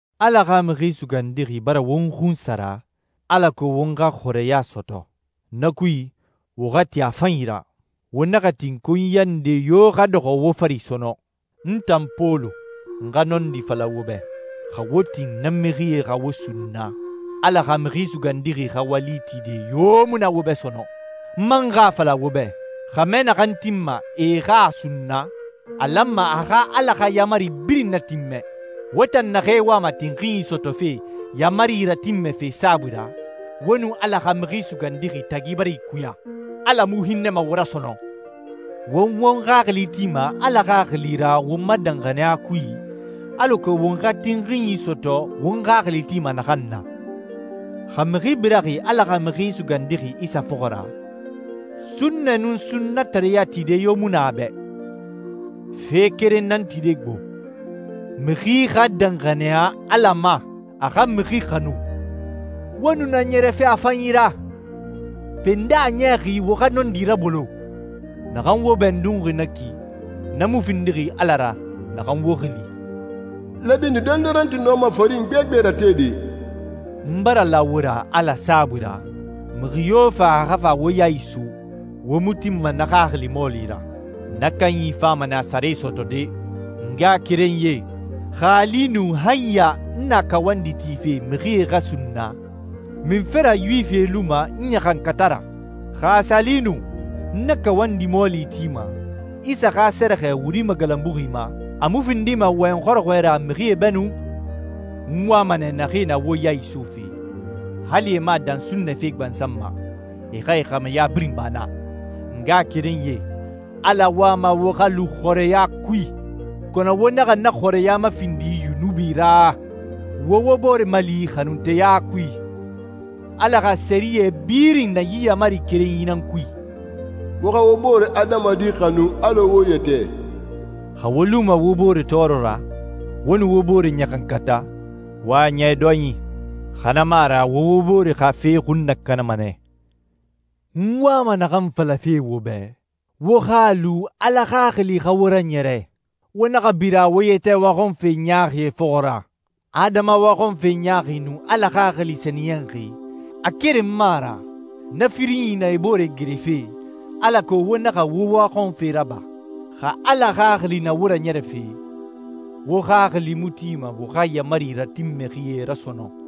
Ala xa Mixi Sugandixi bara won xunsara, alako won xa xɔrɛya sɔtɔ. Na kui, wo xa ti a fanyi ra. Wo naxa tin konyiya nde yo xa dɔxɔ wo fari sɔnɔn. N tan Pɔlu, n xa nɔndi fala wo bɛ, xa wo tin na mixie xa wo sunna, Ala xa Mixi Sugandixi xa wali tide yo mu na wo bɛ sɔnɔn. N man xa a fala wo bɛ, xɛmɛ naxan tinma e xa a sunna, a lanma a xa Ala xa yaamari birin natinmɛ. Wo tan naxee wama tinxinyi sɔtɔfe yaamarie ratinmɛfe saabui ra, wo nun Ala xa Mixi Sugandixi tagi bara ikuya. Ala mu hinnɛma wo ra sɔnɔn. Won won xaxili tima Ala Xaxili ra won ma danxaniya kui, alako won xa tinxinyi sɔtɔ won xaxili tima naxan na. Xa mixi biraxi Ala xa Mixi Sugandixi Isa fɔxɔ ra, sunnɛ nun sunnatareya tide yo mu na a bɛ. Fe keren nan tide gbo: Mixi xa danxaniya Ala ma, a xa mixi xanu. Wo nu na ɲɛrɛfe a fanyi ra. Pe, nde a niyaxi wo xa nɔndi rabolo? Naxan wo bɛndunxi na ki, na mu findixi Ala ra naxan wo xili. Lɛbini dondoronti nɔma farin gbegbe ratede. N bara la wo ra Ala saabui ra, mixi yo fa a xa fa wo ya iso, wo mu tinma na xaxili mɔɔli ra. Na kanyi fama nɛ a sare sɔtɔde. N ngaxakerenyie, xa a li nu han ya n na kawandi tife mixie xa sunna, munfe ra Yuwifie luma n ɲaxankata ra? Xa a sa li nu n na kawandi mɔɔli tima, Isa xa sɛrɛxɛ wuri magalanbuxi ma, a mu findima wɔyɛn xɔrɔxɔɛ ra mixie bɛ nu. N wama nɛ naxee na wo ya isofe, hali e mu a dan sunnɛ fe gbansan ma. E xa e xɛmɛya birin ba na. N ngaxakerenyie, Ala wama wo xa lu xɔrɛya kui, kɔnɔ wo naxa na xɔrɛya mafindi yunubi ra. Wo wo bore mali xanunteya kui. Ala xa sɛriyɛ birin na yi yaamari kerenyi nan kui: Wo xa wo boore adamadi xanu alɔ wo yɛtɛ. Xa wo luma wo bore tɔɔrɔ ra, wo nu wo bore ɲaxankata, wo a niya dɔyin, xa na mu a ra wo wo bore xa fe xun nakanama nɛ. N wama naxan falafe wo bɛ, wo xa a lu Ala Xaxili xa wo raɲɛrɛ. Wo naxa bira wo yɛtɛ waxɔnfe ɲaaxie fɔxɔ ra. Adama waxɔnfe ɲaaxi nun Ala Xaxili sɛniyɛnxi, a keren mu a ra. Na firinyi na e bore gerefe, alako wo naxa wo waxɔnfe raba. Xa Ala Xaxili na wo raɲɛrɛfe, wo xaxili mu tima wo xa yaamari ratinmɛxie ra sɔnɔn.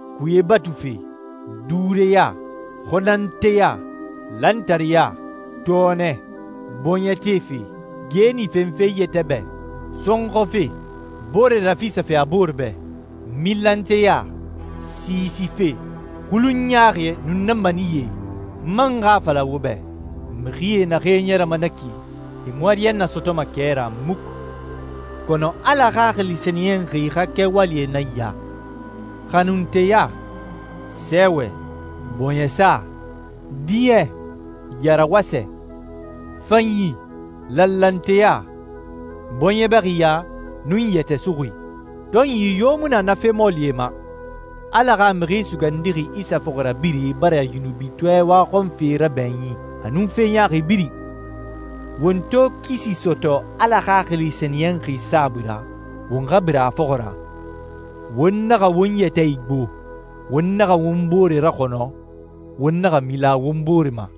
kuye batufe, duureya, xɔnnanteya, lantareya, tɔɔnɛ, bɔɲɛ tefe, geeni fenfe i yɛtɛ bɛ, sɔnxɔfe, boore rafisafe a boore bɛ, milanteya, siisife, xulunyi ɲaaxie, nun na maniyɛe. N man xa a fala wo bɛ, mixi naxee ɲɛrɛma na ki, e mu ariyanna sɔtɔma kɛ ra muku. Kɔnɔ Ala Xaxili Sɛniyɛnxi xa kɛwalie nan ya: xanunteya, sɛɛwɛ, bɔɲɛsa, diɲɛ, yarawasɛ, fanyi, lanlanteya, bɔɲɛ bɛxiya, nun yɛtɛ suxui. Tɔnyi yo mu na na fe mɔɔlie ma. Ala xa Mixi Sugandixi Isa fɔxirabirɛe bara yunubitɔɛ waxɔnfe rabɛɲin a nun fe ɲaaxi birin. Won to kisi sɔtɔ Ala Xaxili Sɛniyɛnxi saabui ra, won xa bira a fɔxɔ ra. Won naxa won yɛtɛ igbo, won naxa won bore raxɔnɔ, won naxa mila won bore ma.